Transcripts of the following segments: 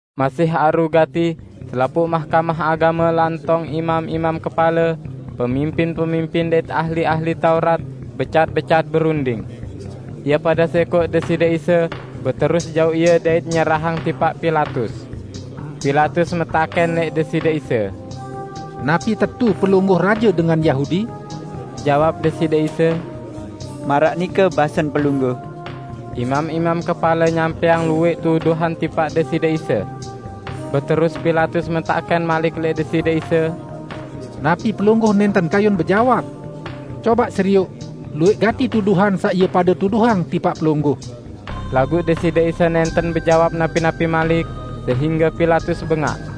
Masih aru gati, selapuq Mahkamah Agame lantong imam-imam kepale, pemimpin-pemimpin dait ahli-ahli Taurat becat-becat berunding. Ie pade sẽkoq Deside Isa beterus jauq Ie dait nyerahang tipaq Pilatus. Pilatus metakẽn lẽq Deside Isa, "Napi tetu Pelungguh raje dengan Yahudi?" Jawab Deside Isa, "Maraq nike basen pelungguh." Imam-imam kepale nyampẽang luwẽq tuduhan tipaq Deside Isa. Beterus Pilatus metakẽn malik lẽq Deside Isa, "Napi Pelungguh nẽnten kayun bejawab? Cobaq serioq luwẽq gati tuduhan saq ie pade tuduhang tipaq Pelungguh!" Laguq Deside Isa nẽnten bejawab napi-napi malik, sehingge Pilatus bengaq.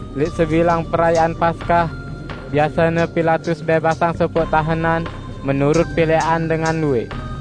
Lẽq sebilang Perayaan Paskah, biasene Pilatus bẽbasang sopoq tahenan menurut pilẽqan dengan luwẽq.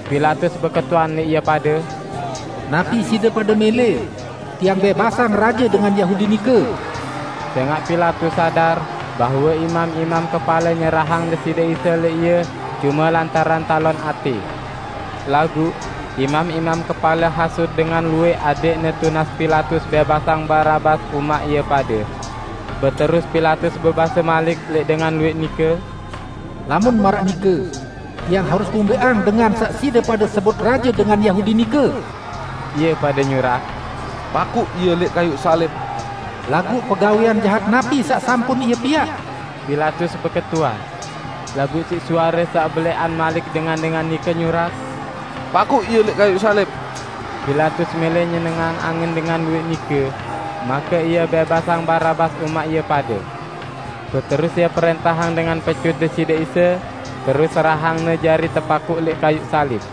Pilatus beketuan lẽq ie pade, "Napi side pade mẽlẽ, tiang bẽbasang raje dengan Yahudi nike?" Sẽngaq Pilatus sadar bahwe imam-imam kepale nyerahang Deside Isa lẽq ie cume lantaran talon atẽ. Laguq imam-imam kepale hasut dengan luwẽq adẽqne tunas Pilatus bẽbasang Barabas umaq ie pade. Beterus Pilatus bebase malik lẽq dengan luwẽq nike, "Lamun maraq nike, tiang harus kumbẽqang dengan saq side pade sebut raje dengan Yahudi nike?" Ie pade nyurak, "Pakuq Ie lẽq kayuq salib!" "Laguq pegawẽan jahat napi saq sampun Ie piaq?" Pilatus beketuan. Laguq siq suare saq belẽqan malik dengan-dengan nike bekuih, "Pakuq Ie lẽq kayuq salib!" Pilatus mẽlẽ nyenengang angen dengan luwẽq nike, make ie bẽbasang Barabas umaq ie pade. Beterus ie prẽntahang dengan pecut Deside Isa, terus serahang-Ne jari tepakuq lẽq kayuq salib.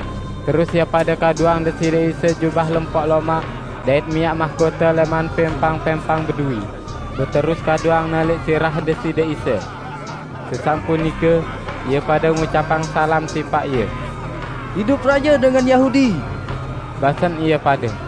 Terus ie pade kaduang Deside Isa jubah lempok lomaq dait miaq mahkote lẽman pẽmpang-pẽmpang beduwi, beterus kaduangne lẽq sirah Deside Isa. Sesampun nike, ie pade ngucapang salam tipaq Ie. "Idup raje dengan Yahudi!" basen ie pade.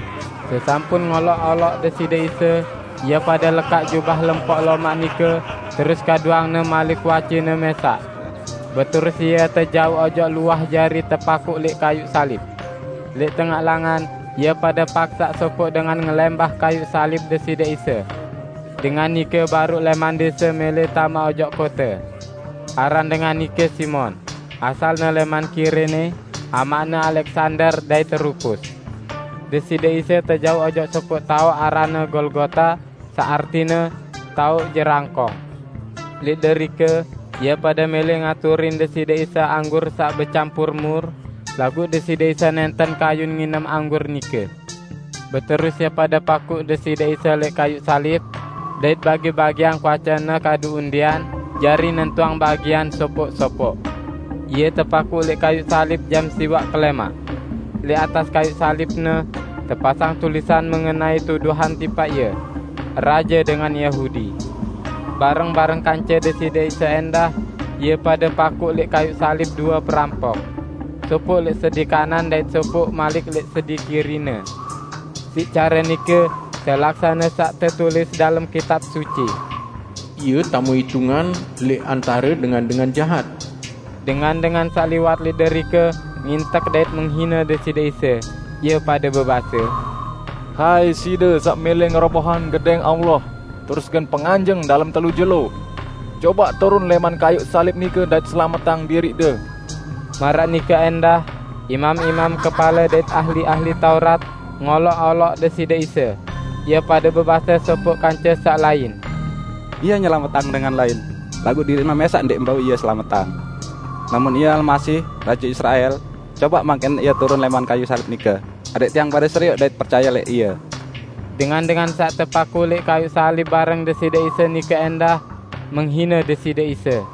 Sesampun ngoloq-oloq Deside Isa, ie pade lekaq jubah lempok lomaq nike terus kaduangne malik kuace-Ne mẽsaq. Beterus Ie tejauq ojok luah jari tepakuq lẽq kayuq salib. Lẽq tengaq langan, ie pade paksaq sopoq dengan ngelẽmbah kayuq salib Deside Isa. Dengan nike baruq lẽman dẽse mẽlẽ tame ojok kote. (Aran dengan nike Simon, -- asalne lẽman Kirene -- amaqne Aleksander dait Rupus.) Deside Isa tejauq ojok sopoq taoq aranne Golgota saq artine "Taoq Jerangkong". Lẽq derike ie pade mẽlẽ ngaturin Deside Isa anggur saq becampur mur, laguq Deside Isa nẽnten kayun nginem anggur nike. Beterus ie pade pakuq Deside Isa lẽq kayuq salib dait bagi-bagiang kuace-Ne kadu undian jari nentuang bagian sopoq-sopoq. Ie tepakuq lẽq kayuq salib jam siwaq kelẽmaq. Lẽq atas kayuq salib-Ne tepasang tulisan mengenai tuduhan tipaq Ie: "Raje Dengan Yahudi". Bareng-bareng kance Deside Isa ẽndah, ie pade pakuq lẽq kayuq salib due perampok; sopoq lẽq sedi kanan dait sopoq malik lẽq sedi kiri-Ne. [ Siq care nike telaksane saq tetulis dalem Kitab Suci: "Ie tame itungan lẽq antare dengan-dengan jahat."] Dengan-dengan saq liwat lẽq derike ngintek dait menghine Deside Isa, ie pade bebase, "Hai, Side saq mẽlẽ ngerobohang Gedẽng Allah terus gen penganjeng dalem telu jelo. Cobaq turun lẽman kayuq salib nike dait selametang diriq-De!" Maraq nike ẽndah imam-imam kepale dait ahli-ahli Taurat ngoloq-oloq Deside Isa. Ie pade bebase sopoq kance saq lain, "Ie nyelametang dengan lain, laguq diriq-Ne mẽsaq ndẽq bau Ie selametang! Lamun Ie Almasih, Raje Israel, cobaq mangkin Ie turun lẽman kayuq salib nike, adẽq tiang pade serioq dait percaye lẽq Ie!" Dengan-dengan saq tepakuq lẽq kayuq salib bareng Deside Isa nike ẽndah menghine Deside Isa.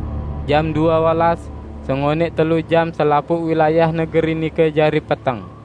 Jam due olas, sengonẽq telu jam selapuq wilayah negeri nike jari peteng.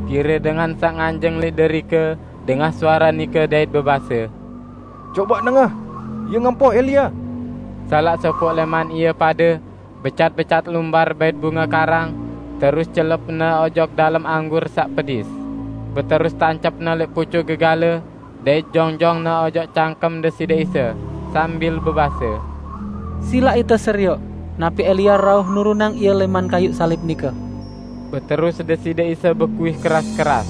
Pire dengan saq nganjeng lẽq derike, dengah suare nike dait bebase, "Cobaq dengah, Ie ngempoh Elia!" Salaq sopoq lẽman ie pade becat-becat lumbar bait bunge karang, terus celepne ojok dalem anggur saq pedis, beterus tancepne lẽq pucuk gegale, dait jonjongne ojok cangkem Deside Isa, sambil bebase, "Silaq ite serioq napi Elia rauh nurunang Ie lẽman kayuq salib nike." Beterus Deside Isa bekuih keras-keras,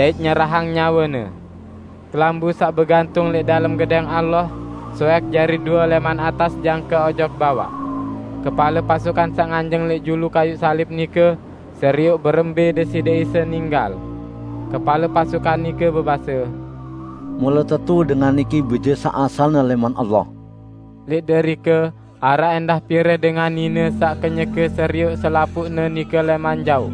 dait nyerahang nyawe-Ne. Kelambu saq begantung lẽq dalem Gedẽng Allah soẽk jari due lẽman atas jangke ojok bawaq. Kepale pasukan saq nganjeng lẽq julu kayuq salib nike, serioq berembẽ Deside Isa ninggal. Kepale pasukan nike bebase, "Mule tetu dengan niki Bije saq asalne lẽman Allah!" Lẽq derike araq ẽndah pire dengan nine saq kenyeke serioq selapuqne nike lẽman jaoq.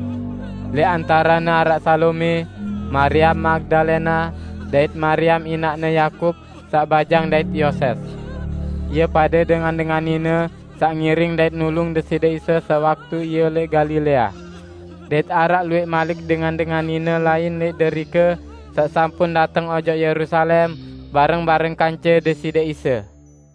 Lẽq antarene araq Salome, Mariam Magdalena, dait Mariam inaqne Yakub saq bajang dait Yoses. Ie pade dengan-dengan nine saq ngiring dait nulung Deside Isa sewaktu Ie lẽq Galilea. Dait araq luwẽq malik dengan-dengan nine lain lẽq derike saq sampun dateng ojok Yerusalem bareng-bareng kance Deside Isa.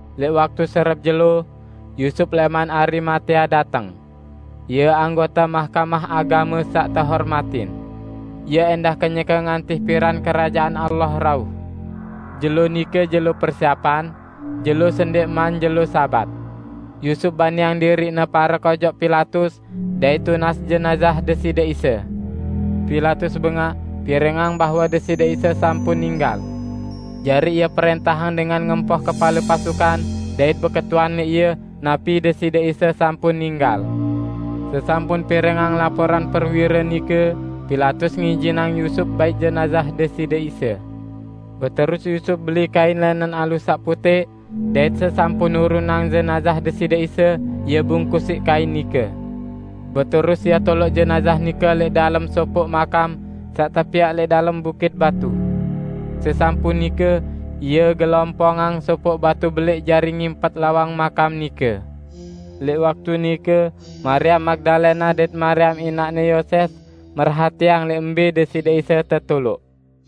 Lẽq waktu serep jelo Yusup lẽman Arimatea dateng. Ie anggote Mahkamah Agame saq tehormatin. Ie ẽndah kenyeke ngantih piran Kerajaan Allah rauh. Jelo nike jelo persiepan (jelo sendẽqman jelo Sabat). Yusup baniang diriqne parek ojok Pilatus dait tunas jenazah Deside Isa. Pilatus bengaq pirengang bahwe Deside Isa sampun ninggal. Jari ie prẽntahang dengan ngempoh kepale pasukan dait beketuan lẽq ie napi Deside Isa sampun ninggal. Sesampun pirengang laporan prewire nike, Pilatus ngijinang Yusup bait jenazah Deside Isa. Beterus Yusup beli kain lẽnen alus saq putẽq, dait sesampun nurunang jenazah Deside Isa, ie bungkus siq kain nike. Beterus ie toloq jenazah nike lẽq dalem sopoq makam saq tepiaq lẽq dalem bukit batu. Sesampun nike, ie gelompongang sopoq batu belẽq jari ngimpet lawang makam nike. Lẽq waktu nike Mariam Magdalena dait Mariam inaqne Yoses merhatiang lẽq mbẽ Deside Isa tetoloq.